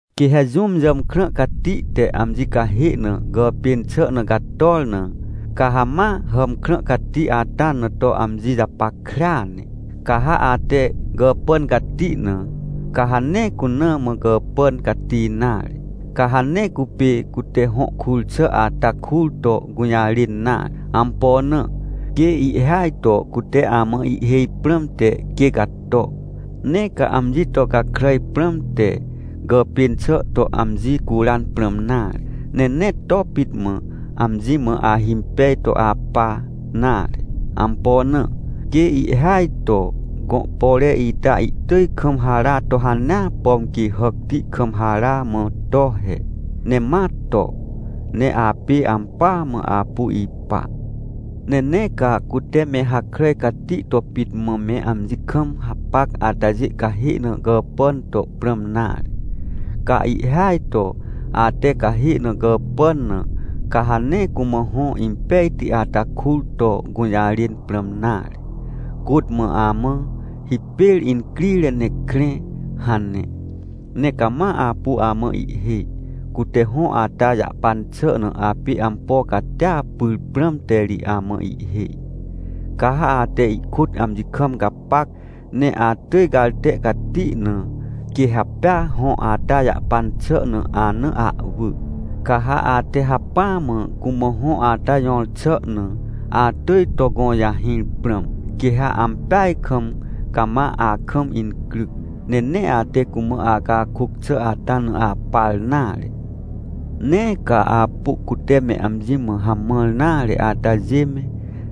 Quê ha jũm jàmkrã cati te amji cahê na gàpên xà na gator na, ca ha ma hàmkrã cati ata na to amji japackrea ne. Ca ha ate gàpàn cati na, ca ha nee cuna mã gàpàn cati nare. Ca ha nee cupê cute hõ kur xà ata kur to gũjarên nare. Ampo na? Quê ihhêaj to cute amã ihhêj prãmte quê gato. Nee ca amji to gakràj prãmte, gàpên xà to amji curan prãm nare, ne nee to pit mã, amji mã ahimpej to apa nare. Ampo na? Quê ihhêaj to gõ pore ita ihtỳj kam hara to hanea, pom quê hàcti kam hara mã to he. Ne ma to, ne apê ampỳa mã apu ipa. Ne nee ca cute me hakràj cati to pit mã me amji kam hapac atajê cahê na gàpàn to prãm nare. Ca ihhêaj to ate cahê na gàpàn na, ca ha nee cumã hõ impejti ata kur to gũjarên prãm nare. Côt mã amã: — Hipêr incrire ne krẽ — hane, ne cama apu amã ihhêj. Cute hõ ata jahpan xà na apê ampo catia pyr prãmte ri amã ihhêj. Ca ha ate ihkôt amji kam gapac, ne atỳj garte cati na, quê ha pea hõ ata jahpan xà na ana ahwỳ. Ca ha ate hacpỹa mã cumã hõ ata jõr xà na, atỳj to gõjahĩr prãm. Quê ha ampeaj kam cama akam incryc, ne nee ate cumã acakôc xà ata na apar nare. Nee ca apu cute me amji mã hamãr nare atajê me,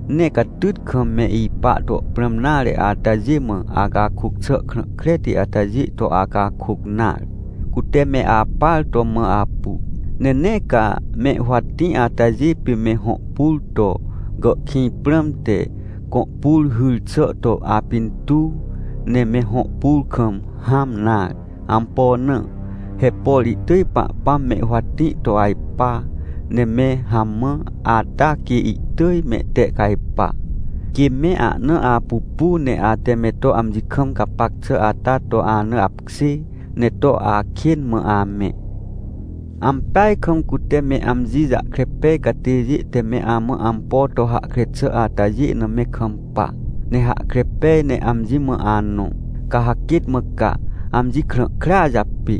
nee catyt kam me ipa to prãm nare atajê mã, acakôc xà krã kreti atajê to acakôc nare, cute me apar to mã apu. Ne nee ca me huwatĩ atajê pê me hõ pur to gàhkĩj prãmte, gõ pur hyr xà to apintuw, ne me hõ pur kam hãm nare. Ampo na? He por ihtỳj Pahpãm me huwatĩ to ajpa, ne me hamã, ata quê ihtỳj mehtehcajpa, quê me ahna apupu ne ate me to amji kam gapac xà ata to ana apkjê, ne to akên mã amẽ. Ampeaj kam cute me amji jahkre pej catêjê te me amã ampo to hahkre xà atajê na me kampa, ne hahkre pej ne amji mã anõ, ca ha quêt mã ca, amji krã krea japê.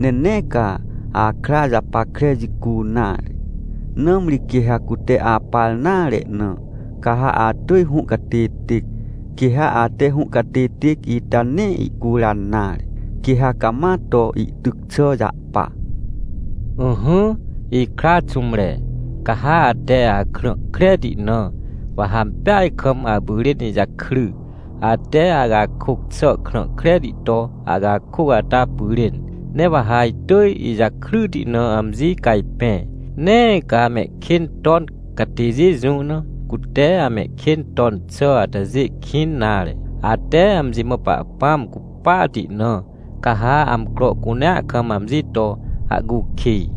Ne nee ca akra japackre jicu nare. Nãmri quê ha cute apar nare na, ca ha atỳj hũhcatêtêc. Quê ha ate hũhcatêtêc ita nee ihcuran nare. Quê ha cama to ihtyc xà jahpa. Ỹhỹ, ikra xũmre. Ca ha ate akrã kreti na, wa ha ampeaj kam apyrên ijakry, ate acakôc xà krã kreti to acakôc ata pyrên. Ne wa ha itỳj ijakryti na amji cajpẽ. Nee ca mehkên ton catêjê jũ na, cute amehkên ton xà atajê kĩn nare. Ate amji mã Pahpãm cupahti na, ca ha amcro cunea kam amji to ahcukij.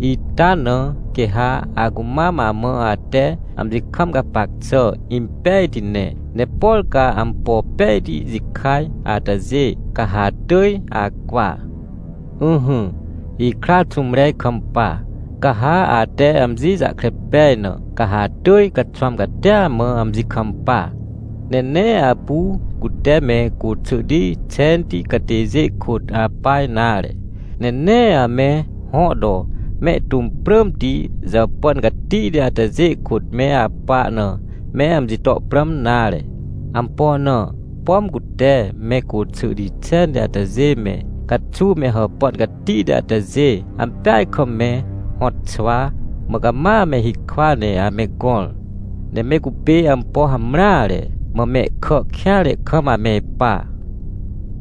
Ita na quê ha acumam amã ate amji kam gapac xà impejti ne, ne por ca ampo pejti jikaj atajê, ca ha atỳj acwa. Ỹhỹ, ikra xũmre ikampa. Ca ha ate amji jahkre pej na, ca ha atỳj caxwãm catia mã amji kampa. Ne nee apu cute me côxỳhti xenti catêjê kôt apa nare, ne nee ame hõ to mehtũm prãmti jàpàn catihti atajê kôt me apa na me amji to prãm nare. Ampo na? Pom cute me côxỳhti xenti atajê me, caxuw me hàpàn catihti atajê, ampeaj kam me hõtxwa, mã cama me hikwa ne ame gõr. Ne me cupê ampo hamreare, mã mehkà kêanre kam ame ipa.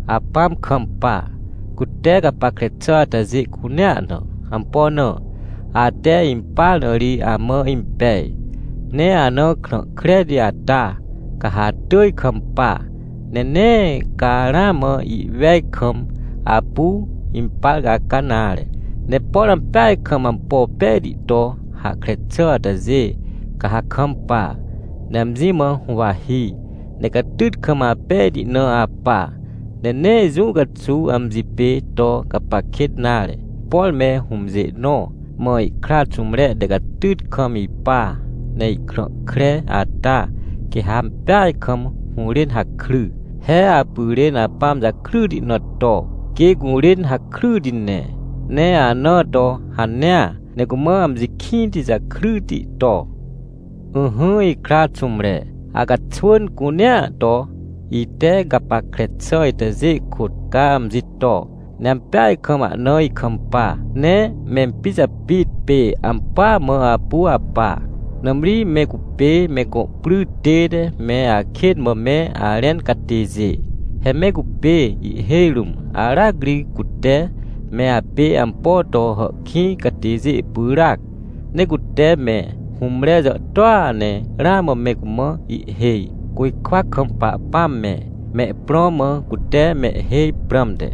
Apãm kampa, cute gapackre xà atajê cunea na. Ampo na? Ate impar na ri amã impej. Ne anã krã kreti ata, ca ha atỳj kampa, ne nee ca ramã ihwej kam apu impar caca nare. Ne por ampeaj kam ampo pejti to hahkre xà atajê, ca ha kampa, ne amji mã huwahi, ne catyt kam apejti na apa, ne nee jũ caxuw amji pê to gapac kêt nare. Por me hũmjê nõ mã ihkra xũmre te catyt kam ipa, ne ihkrã kre ata, quê ha ampeaj kam hũrên hakry. He apyrên apãm jakryti na to, quê gũrên hakryti ne. Ne anã to hanea, ne cumã amji kĩnti jakryti to. Ỹhỹ ikra xũmre, acaxwỳn cunea to, ite gapackre xà itajê kôt ca amji to, ne ampeaj kam ahna ikampa. Ne mempijapit pê ampỳa mã apu apa. Nãmri me cupê me gõ pry tête me akên mã me arẽn catêjê. He me cupê ihhêj rũm aracri cute me apê ampo to hàhkĩj catêjê pyràac. Ne cute me hũmre jàhtôa ne ramã me cumã ihhêj, côjkwa kam Pahpãm me, mehprõ mã cute mehhêj prãmte.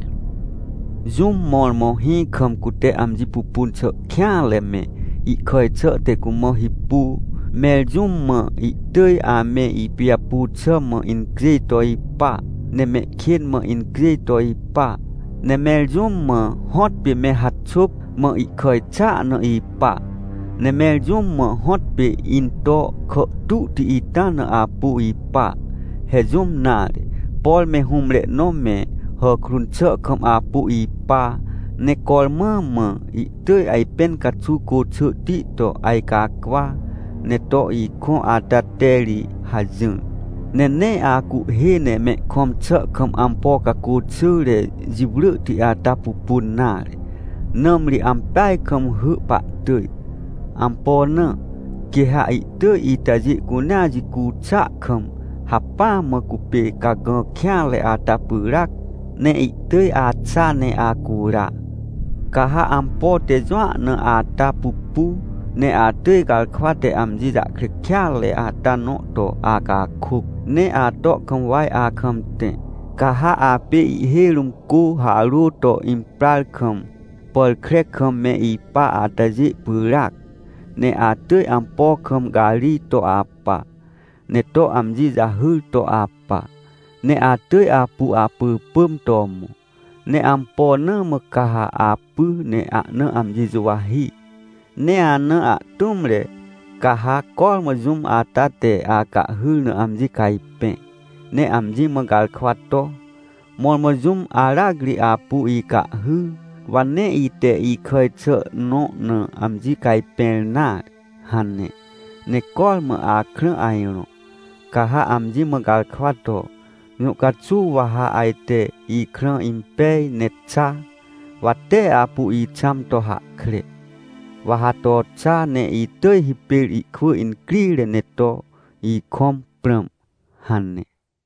Jũm mõrmõ hĩ kam cute amji pupun xà kêanre me, ihkàj xà te cumã hipu? Mẽr jũm mã ihtỳj ame ipijapu xà mã incjêj to ipa, ne mehkên mã incjêj to ipa? Ne mẽr jũm mã hõtpê me haxôp, mã ihkàj xàa na ipa? Ne mẽr jũm mã hõtpê into kàhtuhti ita na apu ipa? He jũm nare, por me hũmre nõ me hàkrun xà kam apu ipa, ne cormã mã ihtỳj ajpẽn caxuw côxỳhti to ajcacwa, ne to ikõ ata te ri hajỹr. Ne nee acuhhê ne mehkõm xà kam ampo cacô xỳre jiwrỳhti ata pupun nare, nãmri ampeaj kam hỳ pahtỳj. Ampo na? Quê ha ihtỳj itajê cunea jicu xàa kam hacpỹa mã cupê cagã kêanre ata pyràc, ne ihtỳj axa ne acura! Ca ha ampo te jũa na ata pupu, ne atỳj garkwa te amji jahkre kêatre ata nõ to acakôc. Ne ato kam waj akam tẽ, ca ha apê ihhêj rũm cô harô to imprar kam, pàr kre kam me ipa atajê pyràac, ne atỳj ampo kam garij to apa, ne to amji jahyr to apa, ne atỳj apu apỳpỳm to mõ. Ne ampo na mã ca ha apy ne ahna amji juwahi? Ne ana ahtũmre, ca ha cormã jũm ata te acahhyr na amji cajpẽ, ne amji mã garkwa to: — Mõrmõ jũm aracri apu icahhy, wa nee ite ikàj xà nõ na amji cajpẽr nare — hane. Ne cormã akrã ajrõ, ca ha amji mã garkwa to: — Jũ caxuw wa ha ajte ikrã impej ne xa? Wa tee apu ixãm to hahkre. Wa ha to xa ne itỳj hipêr ihkwỳ incrire ne to ikõm prãm — hane.